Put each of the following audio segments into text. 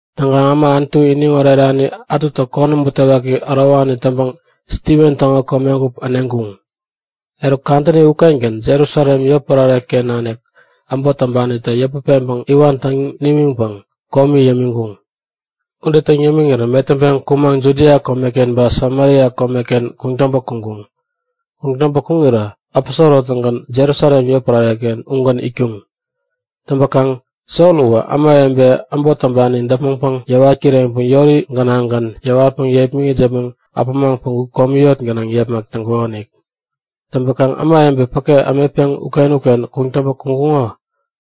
Täŋkaŋ äma Anutu iniŋ orerani ätutä konäm butewaki ärowani täŋpäŋ Stiven täŋo komegup äneŋkuŋ. Eruk kadäni ukengän Jerusalem yotpärare-ken nanik äbot täŋpanita yäput peŋpäŋ iwan täŋ nimiŋpäŋ komi yämiŋkuŋ. Ude täŋ yämiŋirä metäŋpeŋ kumaŋ Judia komeken ba Samaria komeken kuŋtäŋpä kuŋkuŋ. Kuŋtäŋpä kuŋirä aposoro-tägän Jerusalem yotpärare ugän itkuŋ. Täŋpäkaŋ Sol uwä ämawebe äbot täŋpani däpmäŋpäŋ yäwat kireŋpäŋ yori gänaŋgän yäwatpäŋ yepmäŋit yäpmäŋ äpämaŋ päŋku komi yot gänaŋ yepmak täŋkukonik. Täŋpäkaŋ ämawebe päke ämetpeŋ uken-uken kuŋtäŋpä kuŋkuŋo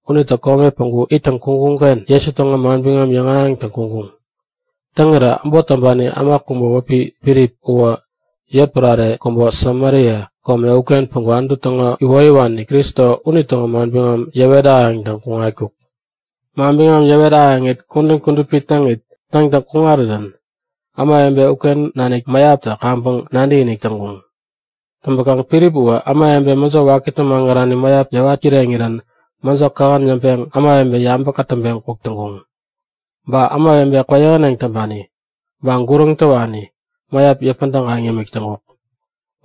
unitä kome päŋku ittäŋ kuŋkuŋ-ken Jesu täŋo manbiŋam yäŋahäŋtäŋ kuŋkuŋ. Täŋirä äbot täŋpani äma kubä wäpi Filip uwä yotpärare kubä Samaria kome uken päŋku Anutu täŋo iwoyäwani Kristo unitäŋo manbiŋam yäwet ahäŋtäŋ kuŋatkuk. Manbiŋam yäwet ahäŋit kudän kudupi täŋit täŋtäŋ kuŋarirän ämawebe uken nanik mäyaptä kaŋpäŋ nadäkinik täŋkuŋ. Täŋpäkaŋ Filip uwä ämawebe mäjo wakitä magärani mäyap yäwat kireŋirän mäjo kähän yäŋpeŋ ämawebe yabä kätäŋpeŋ kuk täŋkuŋ. Ba ämawebe kwäyähäneŋ täŋpani ba guräŋ täwani mäyap yäpä tägaŋ yämik täŋkuk.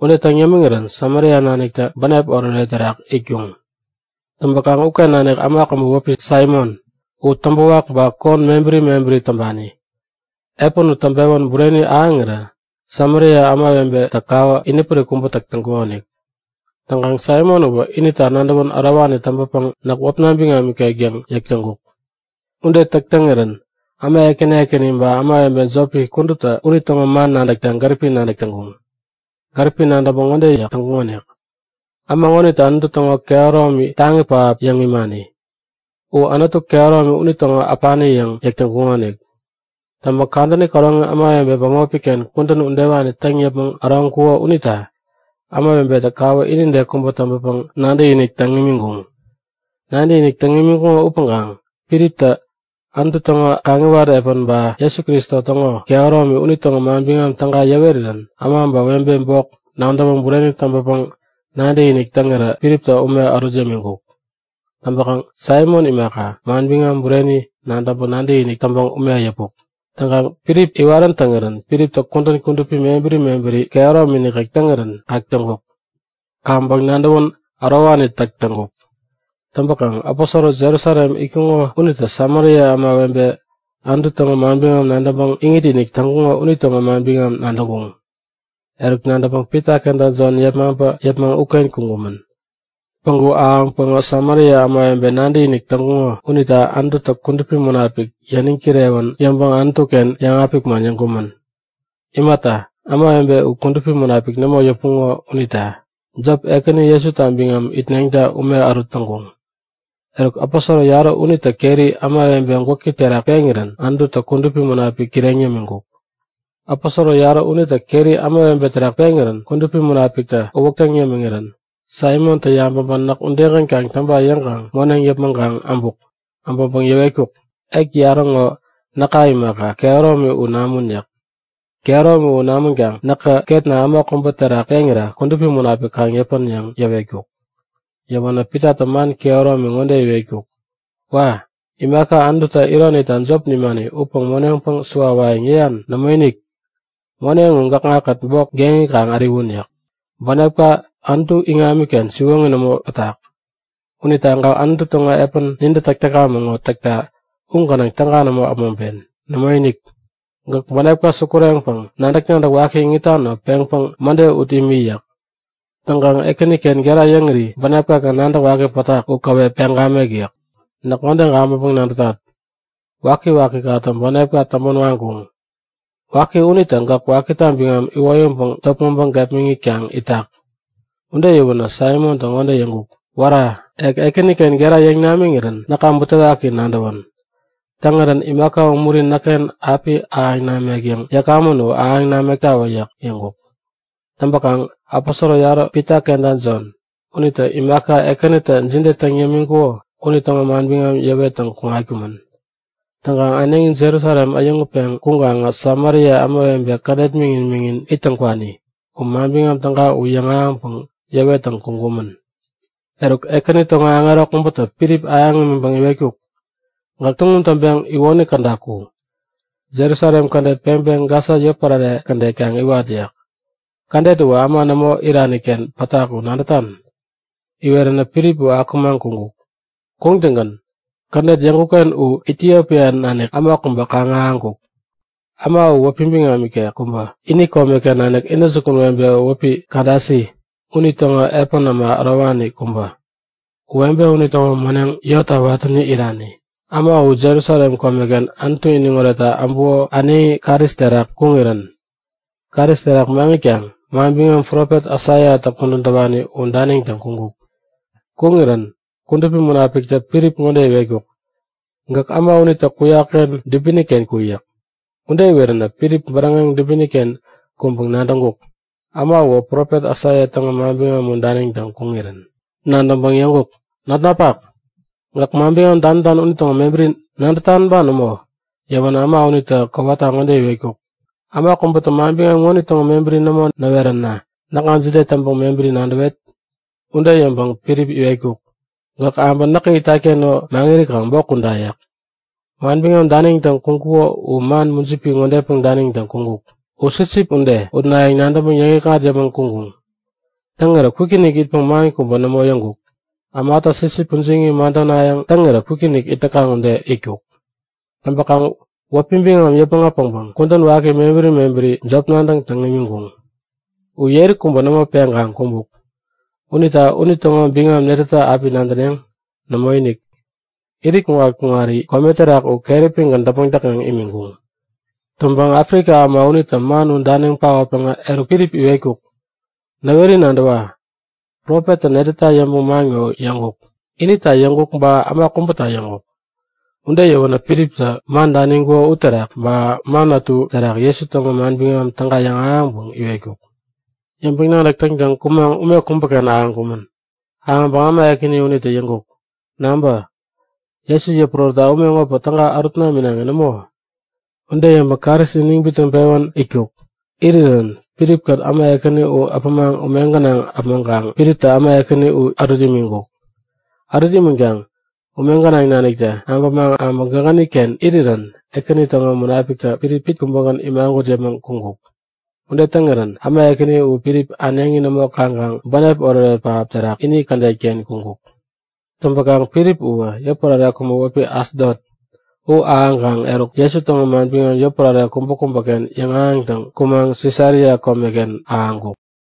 Ude täŋ yämiŋirän Samaria naniktä bänep oretoret terak itkuŋ. Täŋpäkaŋ uken nanik äma kubä wäpi Saimon. U täŋpäwak ba kon mebäri mebäri täŋpani. Epän u täŋpewän bureni ahäŋirä Samaria ämawebetä kawä inipärik kubä täk täŋkuŋonik. Täŋkaŋ Saimon uwä inita nadäwän ärowani täŋpäpäŋ näk wäpna biŋam nikek yäŋ yäk täŋkuk. Ude täk täŋirän äma ekäni ekäni ba ämawebe jopi kuduptä unitäŋo man nadäkta gäripi nadäk täŋkuŋ. Gäripi nadäŋpäŋ ŋode yäk täŋkuŋonik; Äma ŋonitä Anutu täŋo kehäromi taŋi pähap yäŋ imani. U Anutu Kehäromi unitäŋo äpani yäŋ yäk täŋkuŋonik. Täŋpäŋ kadäni käroŋi ämawebe bämopi-ken kudän udewani täŋ yäpmäŋ äroŋkuko unita ämawebetä kawä inide kubä täŋpäpäŋ nadäkinik täŋ imiŋkuŋ. Nadäkinik täŋ imiŋkuŋo upäŋkaŋ Filiptä Anutu täŋo kaŋiwat epän ba Jesu Kristo täŋo kehäromi unitäŋo manbiŋam täga yäwerirän äma ba webe bok nadäwä bureni täŋpäpäŋ nadäkinik täŋirä Filiptä ume ärut yämiŋkuk. Täŋpäkaŋ Saimon imaka, manbiŋam bureni nadäŋpäŋ nadäkinik täŋpäŋ ume yäpuk. Täŋkaŋ Filip iwarän täŋirän Filiptä kudän kudupi mebäri mebäri kehäromi nikek täŋirän kak täŋkuk. Kaŋpäŋ nadäwän ärowani täk täŋkuk. Täŋpäkaŋ aposoro Jerusalem itkuŋo unitä Samaria ämawebetä Anutu täŋo manbiŋam nadäŋpäŋ iŋit-inik täŋkuŋo unitäŋo manbiŋam nadäŋkuŋ. Eruk nadäŋpäŋ Pita kenta Jon yepmaŋpä yäpmäŋ uken kuŋkumän. Päŋku ahäŋpäŋä Samaria ämawebe nadäkinik täŋkuŋo unita Anututä Kudupi Munapik yäniŋ kirewän yäŋpäŋ Anutu-ken yäŋapik man yäŋkumän. Imata, ämawebe u Kudupi Munapik nämo yäpuŋo unita. Jop, Ekäni Jesuta biŋam itneŋta ume ärut täŋkuŋ. Eruk aposoro yarä unitä keri ämawebe gwäki terak peŋirän Anututä Kudupi Munapik kireŋ yämiŋkuk. Aposoro yarä unitä keri ämawebe terak peŋirän Kudupi Munapiktä uwäk täŋ yämiŋirän Saimontä yabäŋpäŋ näk udegän kaŋ täŋpa yäŋkaŋ moneŋ yäpmäŋkaŋ äbuk. Äbäŋpäŋ yäwetkuk; Ek yarä ŋo näka imaka, kehäromi u namun yäk. Kehäromi u namänkaŋ näkä ketna äma kubä terak peŋira Kudupi Munapik kaŋ yäpän yäŋ yäwetkuk. Yäwänä Pitatä man kehäromi ŋode iwetkuk; Wa! Imaka Anututä ironita jop nimani upäŋ moneŋpäŋ suwawayäŋ yäyan? Nämoinik! Moneŋ u gäkŋa-kät bok geŋi kaŋ äriwun! yäk. Bänepka Anutu iŋamiken siwoŋi nämo pätak. Unita gäk Anutu täŋo epän nintä täk täkamäŋ ŋo täkta u gänaŋ täga nämo äpmoŋpen. Nämoinik! Gäk bänepka sukureŋpäŋ nadäk-nadäk waki iŋitan ŋo peŋpäŋ mäde ut imi yäk. Täŋkaŋ Ekäniken gera yäŋiri bänepka-ken nadäk waki pätak, momi u käwep peŋ gamek yäk. Näk ŋode gabäŋpäŋ-nadätat; Wakiwakikatä bänepka täŋpän waŋkuŋ. Waki unitä gäk wakita biŋam iwoyäŋpäŋ topmäŋpäŋ gepmäŋitkaŋ itak. Ude yäwänä Saimontä ŋode yäŋkuk; Wära! Ek Ekäniken gera yäŋ namiŋirän näka butewaki nadäwän. Täŋirän imaka umuri näkken api ahäŋ namek yäŋ yäkamän u ahäŋ namektawä yäŋ yäŋkuk. Täŋpäkaŋ aposoro yarä Pita kenta Jon unitä imaka Ekänitä jide täŋ yämiŋkuko unitäŋo manbiŋam yäwettäŋ kuŋkumän. Täŋkaŋ äneŋi Jerusalem äyäŋutpeŋ kuŋkaŋä Samaria ämawebe kädet miŋin-miŋin ittäŋ kwani u Manbiŋam Täga u yäŋahäŋpäŋ yäwet täŋtäŋ kuŋkumän. Eruk, Ekäni täŋo aŋero kubätä Filip ahäŋ imiŋpäŋ iwetkuk; Gäk tuŋum täŋpeŋ iwoni käda ku. Jerusalem kädet peŋpäŋ Gasa yotpärare kädet kaŋ iwat yäk. Kädet uwä äma nämo irani-ken pätak u nadätan? Iweränä Filip akumaŋ kuŋkuk. Kuŋtäŋgän kädet yäŋkuk-ken u Itiopia nanik äma kubä kaŋ-ahäŋkuk. Äma uwä wäpi biŋam nikek kubä, ini komeken nanik intäjukun webe wäpi Kadasi unitäŋo epän äma ärowani kubä. U webe unitäŋo moneŋ yotta watäni irani. Äma u Jerusalem komeken Anutu iniŋoretta äbuko äneŋi karis terak kuŋirän. Karis terak maŋitkaŋ manbiŋam profet Aisaiatä kudän täwani u daniŋtäŋ kuŋkuk. Kuŋirän Kudupi Munapiktä Filip ŋode iwetkuk; Gäk äma unitä kuyak-ken dubini-ken ku yäk. Ude iweränä Filip bäräŋeŋ dubini-ken kuŋpäŋ nadäŋkuk; Äma uwä profet Aisaia täŋo manbiŋam u daniŋtäŋ kuŋirän. Nadäŋpäŋ yäŋkuk; Notnapak, gäk manbiŋam danitan unitäŋo mebäri nadätan ba nämo? Yäwänä äma unitä kowata ŋode iwetkuk; Äma kubätä manbiŋam ŋonitäŋo mebäri nämo näweränä näkŋa jide täŋpäŋ mebäri nadäwet? Ude yäŋpäŋ Filip iwetkuk; Gäk äbä näkä itat-ken ŋo maŋirikaŋ bok kuda yäk. Manbiŋam daniŋtäŋ kuŋkuko u man mujipi ŋodepäŋ daniŋtäŋ kuŋkuk; U sipsip ude, utnayäŋ nadäŋpäŋ yäŋikŋat yäpmäŋ kuŋkuŋ. Täŋirä kwikinik itpäŋ man kubä nämo yäŋkuk. Ämatä sipsip pujiŋi madänayäŋ täŋirä kwikinik it täkaŋ ude itkuk. Täŋpäkaŋ wäpi biŋam yäpmäŋ äpäŋpäŋ kudän waki mebäri mebäri jop nadäŋ täŋ imiŋkuŋ. U yeri kubä nämo peŋkaŋ kumbuk. Unita unitäŋo biŋam netätä api nadäneŋ? Nämoinik, irit kuŋat-kuŋari kome terak u keräpigän däpmäŋ täkŋeŋ imiŋkuŋ. Täŋpäŋ Afrika äma unitä man u daniŋ paotpäŋä eruk Filip iwetkuk; Näweri nadäwa. Profettä netäta yäŋpäŋ man ŋo yäŋkuk? Inita yäŋkuk, ba äma kubäta yäŋkuk? Ude yäwänä Filiptä man daniŋkuko uterak ba man ätu terak Jesu täŋo manbiŋam täga yäŋahäŋpäŋ iwetkuk. Yäŋpäŋ-nadäk täŋtäŋ kumaŋ ume kubäken ahäŋkumän. Ahäŋpäŋ äma ekäni unitä yäŋkuk; Nabä! Jesu yäpurärätta ume ŋopäŋ täga ärut naminaŋi nämo? Ude yäŋpäŋ karis iniŋ bitnäŋpewän itkuk. Irirän Filip-kät äma ekäni u äpämaŋ ume gänaŋ äpmoŋkaŋ Filiptä äma ekäni u ärut imiŋkuk. Ärut imänkaŋ ume gänaŋ naniktä abämaŋ äbä gägäni-ken irirän Ekäni täŋo Munapiktä Filip pit kubägän imagut yäpmäŋ kuŋkuk. Ude täŋirän äma ekäni u Filip äneŋi nämo kaŋkaŋ bänep oretoret pähap terak ini kädet-ken kuŋkuk. Täŋpäkaŋ Filip uwä yotpärare kubä wäpi Asdot u ahäŋkaŋ, eruk Jesu täŋo manbiŋam yotpärare kubäkubäken yäŋahäŋtäŋ kumaŋ Sisaria komeken ahäŋkuk.